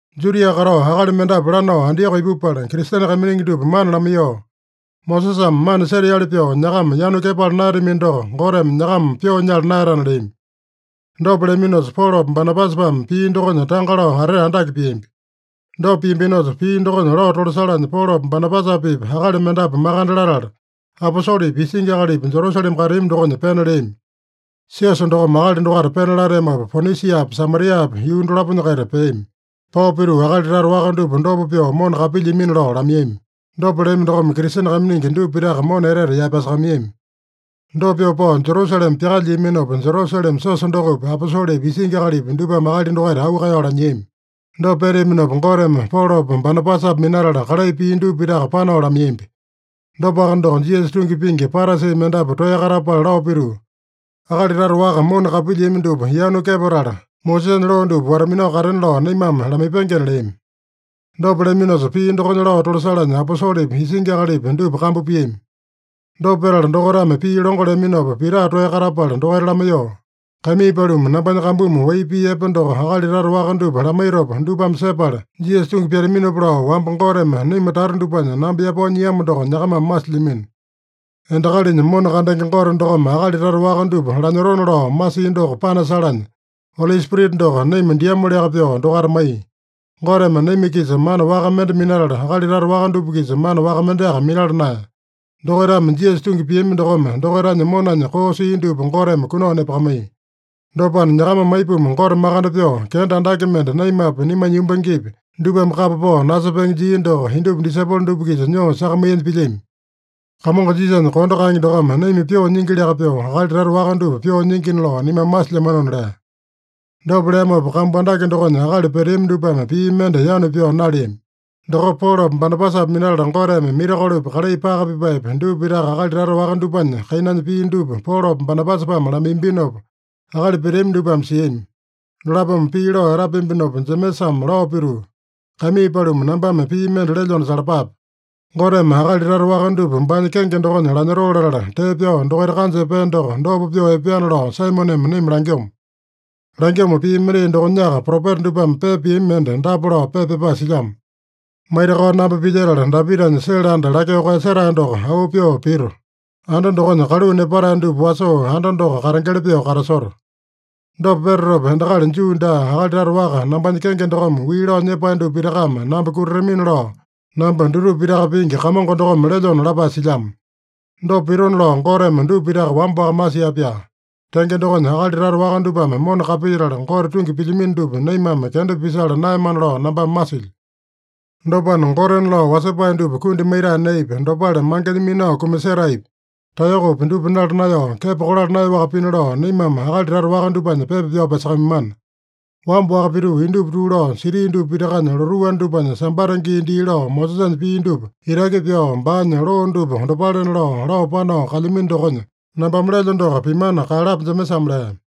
Judia katao akali mendapu lanao Antioko ipupala, Kristene kaiminingi dupa mana lamaiyoo, “Mosesame mana seteali pyoo nyakama yanu kepala naeyatamino doko, Goteme nyakama pyoo nyala naeyatana” leami. Dopa leaminosa, Polopa Banabasapame pii dokonya tanga lao atete andake piambi. Dopa piambinosa, pii dokonya lao tolasalanya, Polopa Banabasapa-pipa akali mendapu makande latala, aposolepi, isingi akalipi, Jerusalema kateami dokonya pena leami. Siosa dokome akali dokaita pena lateamopa, Ponisiapa, Samariapa yuu dolaponya-kaita peami. Pao pituu, akali tata waka dupa dopa pyoo mona kapilyiamina lao lamaiyami. Dopa leami dokome Kristene kaiminingi dupa pitaka mona etete yaepasakamaiyami. Dopa pyoo pao Jerusalema pyakalyiaminopa, Jerusalema siosa dokopi, aposolepi, isingi akalipi dupame akali dokaita auu kaeyao lanyiami. Dopa peteaminopa Goteme Polopa Banabasapa minatala, kalai pia dupa pitaka panao lamaiyambi. Dopaka doko, Jisasa tungi pingi Parasi mendapu toeya katapala lao pituu, “Akali tata waka mona kapilyiami dupa yanu kepatala, Mosesanya loo dupa wata-minao katena lao naimame lamaipengena” leami. Dopa leaminosa, pii dokonya lao tolasalanya aposolepi, isingi akalipi dupa kambu piami. Dopa petala, dokaitame pii longo leaminopa, Pita toeya katapala dokaita lamaiyoo, “Kaimii paluma, nambanya kambumi wai pii epe doko akali tata waka dupa lamaitopa dupame sepala Jisasa tungi pyataminopa lao, wamba Goteme naima tata dupanya namba yapao nyiamo doko nyakamame masilyamino. Endakalinya mona kandenge Gote dokome akali tata waka dupa lanyotona lao masia doko panasalanya, Oli Spirita doko naima diamoliaka pyoo dokaita maiya. Goteme naima-kisa mana waka mende minatala, akali tata waka dupa-kisa mana waka mendeaka minala naeya. Dokaitame Jisasa tungi piami dokome dokaitanya monanya koo sia dupa Goteme kunao nepakamaiya. Dopana, nyakamame aipuma Gote makande pyoo, kenda andake mende, naimapi, naimanya yumbangepi, dupame kapa pao nasepenge jia doko indupa disaipolo dupa-kisa nyoo sakamaiyanya pilyami? Kamongo Jisasanya kondo kaenge dokome naima pyoo nyingiliaka pyoo, akali tata waka dupa pyoo nyingina lao naimame masilyamanona” lea. Dopa leamopa, kambu andake dokonya akali peteami dupame pii mende yanu pyao naleami. Dokopa Polopa Banabasapa minatala Goteme mirakolopi, kalai paka pipaepi, dupa pitaka akali tata waka dupanya kainanya pia dupa Polopa Banabasapame lamaiyambinopa, akali peteami dupame siami. Dolapome pii lao etapeambinopa, Jemesame lao pituu, “Kaimii paluma, nambame pii mende lelyona salapape. Goteme akali tata waka dupa baanya kenge dokonya lanyotoo latala, tee pyao dokaita kanja epea doko, dopa pyoo epeana lao Saimoneme naima langyomo. Langyomo pii mendai dokonyaka propeta dupame pepa piami mende dapa lao pepa pyapae silyamo: ‘Maitakao namba pilyetala, Dapitanya sele anda lakyoo koeyasetae doko auu pyoo pito. Anda dokonya kaluu nepatae dupa wasoo, anda doko katengeli pyoo katasoto. Dopa petatopa, endakali Juu daa, akali tata waka, nambanya kenge dokome wii lao nyepae dupa pitakame namba kutatamina lao, namba dutupa pitaka pingi Kamongo dokome lelyona’ lapae silyamo. Dopa pitona lao Goteme dupa pitaka wamba-waka masia-pyaa. Tenge dokonya, akali tata waka dupame mona kapilyetala, Gote tungi pilyamino dupa naimame kenda pisala naeyamana lao nambame masilyo. Dopana, gotena lao wasepae dupa kundi maitae neepi, dopale mangenya minao kumasetaepi, taeyokopi dupa nala naeyao, kepo kolala naeyaowaka pina lao, naimame akali tata waka dupanya pepa pyao pyasakamaimana. Wamba-waka pituu, indupa tuu lao, siti dupa pitakanya lotuu anda dupanya Sambata gii dii lao Mosesanya pii dupa itaki pyao, baanya loo dupa dopalena lao, lao panao kalyamino dokonya, nambame lelyo doko pimana kaeyalapa” Jemesame lea.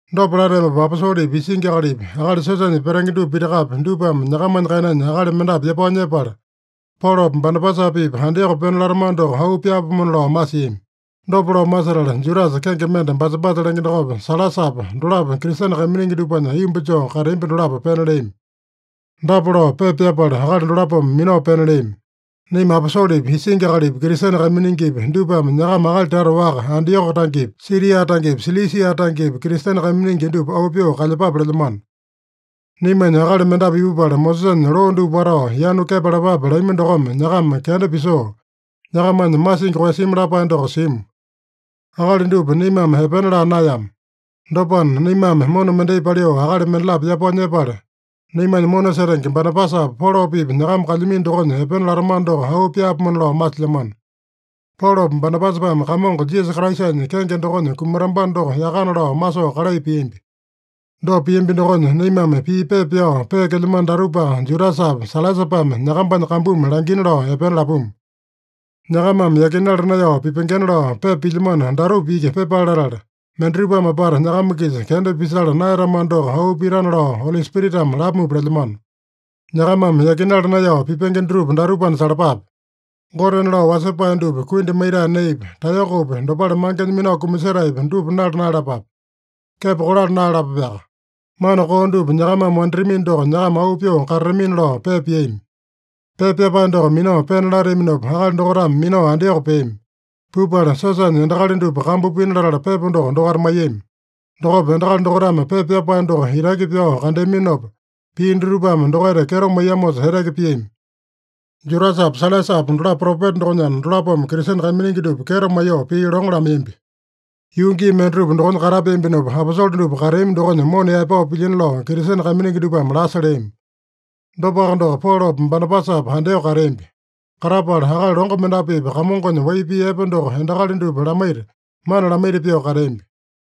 Dopa lateamopa aposolepi, isingi akalipi, akali siosanya petenge dupa pitakapi, dupame nyakamanya kainanya akali mendapu yapao nyepala, Polopa Banabasapa-pipa Antioko pena latamano doko auu pyaapomona lao masiami. Dopa lao masetala, Judasa kenge mende Basabasa lenge dokopa, Sailasapa, dolapo Kristene kaiminingi dupanya aiyomba joo kateambi dolapo pena leami. Dapa lao pepa pyapala, akali dolapome minao pena leami: “Naima aposolepi, isingi akalipi, Kristene kaiminingipi, dupame nyakama akali tata waka, Antioko tangepi, Siria tangepi, Silisia tangepi, Kristene kaiminingi dupa auu pyoo kalyepape lelyamano. Naimanya akali mendapu ipupala, Mosesanya loo dupa watao, yanu kepalapape lami dokome, nyakama kenda pisoo, nyakamanya masingi koeyasimi lapae doko simu. Akali dupa naimame epena laa naeyama. Dopana, naimame mona mendai paliu akali mendalapo yapao nyepala, naimanya mona setenge Banabasapa, Polopa-pipa nyakama kalyamino dokonya epena latamano doko auu pyaapomona lao masilyamano. Polopa Banabasapame Kamongo Jisasa Kraisanya kenge dokonya kumatambano doko yakana lao masoo kalai piambi. Dopa piambi dokonya naimame pii pepa pyao peekelyamano datupaka Judasapa, Sailasapame nyakambanya kambumi langina lao epena lapuma. Nyakamame yakinala naeyao pipengena lao pepa pilyamano datupa iki pyepale latala, mendatupame apata nyakama-kisa kenda pisala naeyatamano doko auu pitana lao Oli Spiritame lamupa lelyamano. Nyakamame yakinala naeyao pipenge dutupa datupana salapape: Gotena lao wasepae dupa kundi maitae neepi, taeyokopi, dopale mangenya minao kumasetaepi, dupa nala naeyalapape. Kepo kolala naeyalapapeaka. Mana koo dupa nyakamame wanditamino doko, nyakama auu pyoo katatamina” lao pepa piami. Pepa pyapae doko minao pena lateaminopa, akali dokaitame minao Antioko peami. Pupala siosanya endakali dupa kambu pina latala, pepa doko dokaita maiyami. Dokopa endakali dokaitame pepa pyapae doko itaki pyao kandeaminopa, pii dutupame dokaita kyeto maiyamosa eteke piami. Judasapa Sailasapa dolapo propeta dokonyana, dolapome Kristene kaiminingi dupa kyeto maiyoo, pii longo lamaiyambi. Yuu gii mendatupa dokonya katapeambinopa, aposole dupa kateami dokonya mona yaepao pilyina lao Kristene kaiminingi dupame lasa leami. Dopaka doko, Polopa Banabasapa Antioko kateambi. Katapala, akali longo mendapu-pipa Kamongonya wai pii epe doko endakali dupa lamaita, mana lamaita pyoo kateambi.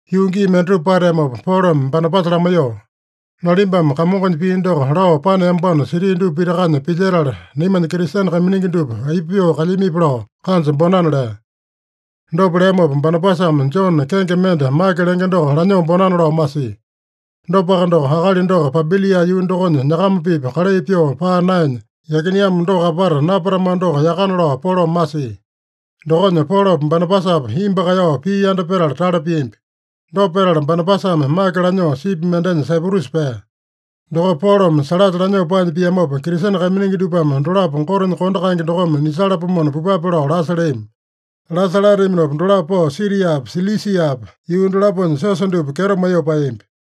Yuu gii mendatupa pateamopa Polome Banabasa lamaiyoo, “Nalimbame Kamongonya pii doko lao paneambano siti dupa pitakanya pilyetala, naimanya Kristene kaiminingi dupa aipa pyoo kalyamipi lao kanja bonana” lea. Dopa leamopa, Banabasame Jone kenge mende Make lenge doko lanyoo bonana lao masia. Dopaka doko, akali doko Pampilia yuu dokonya nyakamba-pipa kalai pyoo paa naenya yakineamo doko apata napatamano doko yakana lao Polome masia. Dokonya Polopa Banabasapa imbu kaeyao pii yanda petala tale piambi. Dopa petala, Banabasame Make lanyoo sipi mendenya Saiprusa pea. Dokopa Polome Sailasa lanyoo paanya piamopa, Kristene kaiminingi dupame dolapo Gotenya kondo kaenge dokome nisalapomona pupape lao lasa leami. Lasa lateaminopa, dolapo pao Siriapa, Silisiapa yuu dolaponya siosa dupa kyeto maiyoo paeyambi.